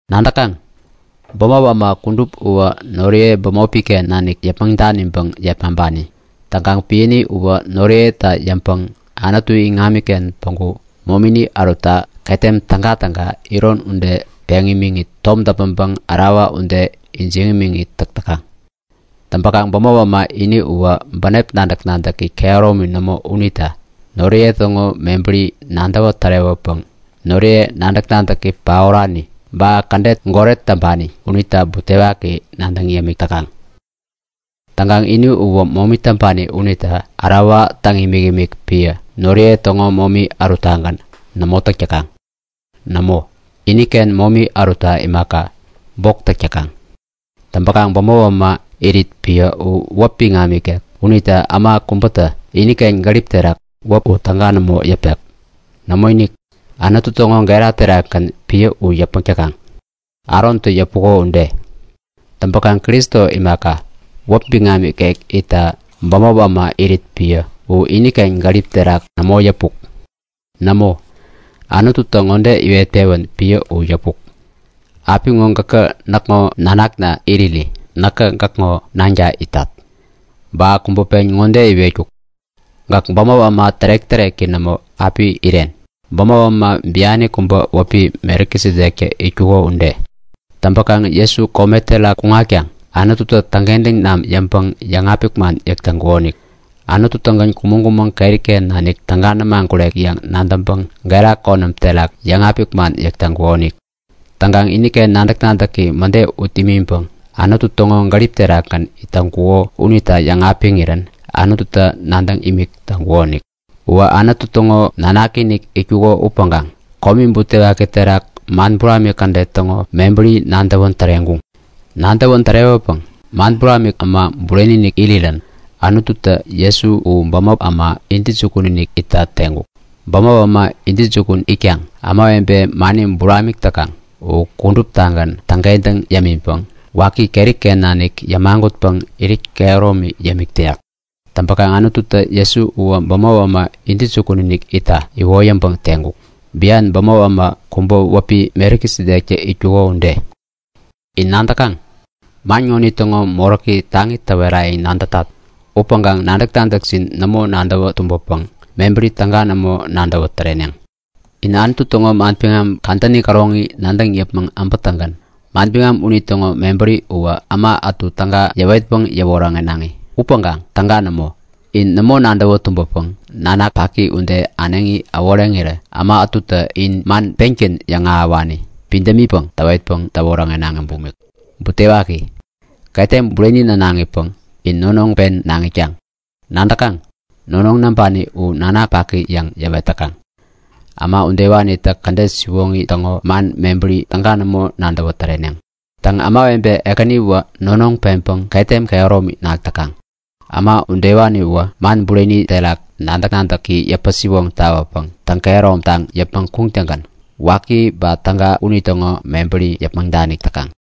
Nadäkaŋ? Bämop äma kudup uwä noriye bämopi-ken nanik yäpmäŋ daniŋpäŋ yepmaŋpani. Täŋkaŋ piäni uwä noriyeta yäŋpäŋ Anutu iŋamiken päŋku momini ärutta ketem tägatäga iron ude peŋ imiŋit tom däpmäŋpäŋ ärawa ude ijiŋ imiŋit täk täkaŋ. Täŋpäkaŋ bämop äma ini uwä bänep nadäk-nadäki kehäromi nämo unita noriye täŋo mebäri nadäwä tärewäpäŋ noriye nadäk-nadäki paorani ba kädet goret täŋpani unita butewaki nadäŋ yämik täkaŋ. Täŋkaŋ ini uwä momi täŋpani unita ärawa täŋ imikimik piä noriye täŋo momi äruttagän nämo täk täkaŋ. Nämo, iniken momi ärutta imaka, bok täk täkaŋ. Täŋpäkaŋ bämop äma irit piä u wäp biŋam ikek unita äma kubätä iniken gärip terak wäp u täga nämo yäpek. Nämoinik, Anutu täŋo gera terakgän piä u yäpmäk täkaŋ, Arontä yäpuko ude. Täŋpäkaŋ Kristo imaka, wäpi biŋam ikek itta bämop äma irit piä u iniken gärip terak nämo yäpuk. Nämo, Anututä ŋode iwet-pewän piä u yäpuk; Apiŋo gäkä näkŋo nanakna iriri näkä gäkŋo nanka itat. Ba kubä pen ŋode iwetkuk; Gäk bämop äma tärek-täreki nämo api iren, bämop äma biani kubä wäpi Melkisedektä itkuko ude. Täŋpäkaŋ Jesu kome terak kuŋatkaŋ Anututä täŋkentäŋ namän yäŋpäŋ yäŋapik man yäk täŋkukonik. Anutu-tägän kumäŋ-kumäŋ keri-ken nanik täga nämagurek yäŋ nadäŋpäŋ gera konäm terak yäŋapik man yäk täŋkukonik. Täŋkaŋ iniken nadäk-nadäki mäde ut imiŋpäŋ Anutu täŋo gärip terakgän it täŋkuko unita yäŋapiŋirän Anututä nadäŋ imik täŋkukonik. Uwä Anutu täŋo nanaki-inik itkuko upäŋkaŋ komi butewaki terak man buramik kädet täŋo mebäri nadäwän täreŋkuŋ. Nadäwän tärewäpäŋ man buramik äma bureni-inik irirän Anututä Jesu u bämop äma intäjukun-inik itta teŋkuk. Bämop äma intäjukun itkaŋ ämawebe mani buramik täkaŋ u kuduptagän täŋkentäŋ yämiŋpäŋ waki keri-ken nanik yämagutpäŋ irit kehäromi yämik täyak. Täŋpäkaŋ Anututä Jesu uwä bämop äma intäjukun-inik itta iwoyäŋpäŋ teŋkuk, bian bämop äma kubä wäpi Melkisedektä itkuko ude. In nadäkaŋ? Man ŋonitäŋo moräki taŋi täwerayäŋ nadätat upäŋkaŋ nadäk-nadäkjin nämo nadäwä tumbäpäŋ mebäri täga nämo nadäwä täreneŋ. In Anutu täŋo manbiŋam kadäni käroŋi nadäŋ yäpmäŋ äbätäŋgän manbiŋam unitäŋo mebäri uwä äma ätu täga yäwetpäŋ yäwoŋärenaŋi upäŋkaŋ täga nämo! In nämo nadäwä tumbäpäŋ nanak paki ude äneŋi äworeŋirä äma ätutä in man pengän yäŋahäwani pidämipäŋ täwetpäŋ täwoŋärenaŋi bumik. Butewaki! Ketem bureni nänaŋipäŋ in nonoŋ pen naŋ itkaŋ! Nadäkaŋ? Nonoŋ näŋpani u nanak paki yäŋ yäwet täkaŋ. Äma udewanitä kädet siwoŋi täŋo man mebäri täga nämo nadäwä täreneŋ. Täŋ, ämawebe ekäniwä nonoŋ peŋpäŋ ketem kehäromi nak täkaŋ. Äma udewaniwä man bureni uterak nadäk-nadäki yäpä-siwoŋ tawäpäŋ täŋ-kehäromtaŋ yäpmäŋ kuŋtäŋgän waki ba täga unitäŋo mebäri yäpmäŋ danik täkaŋ.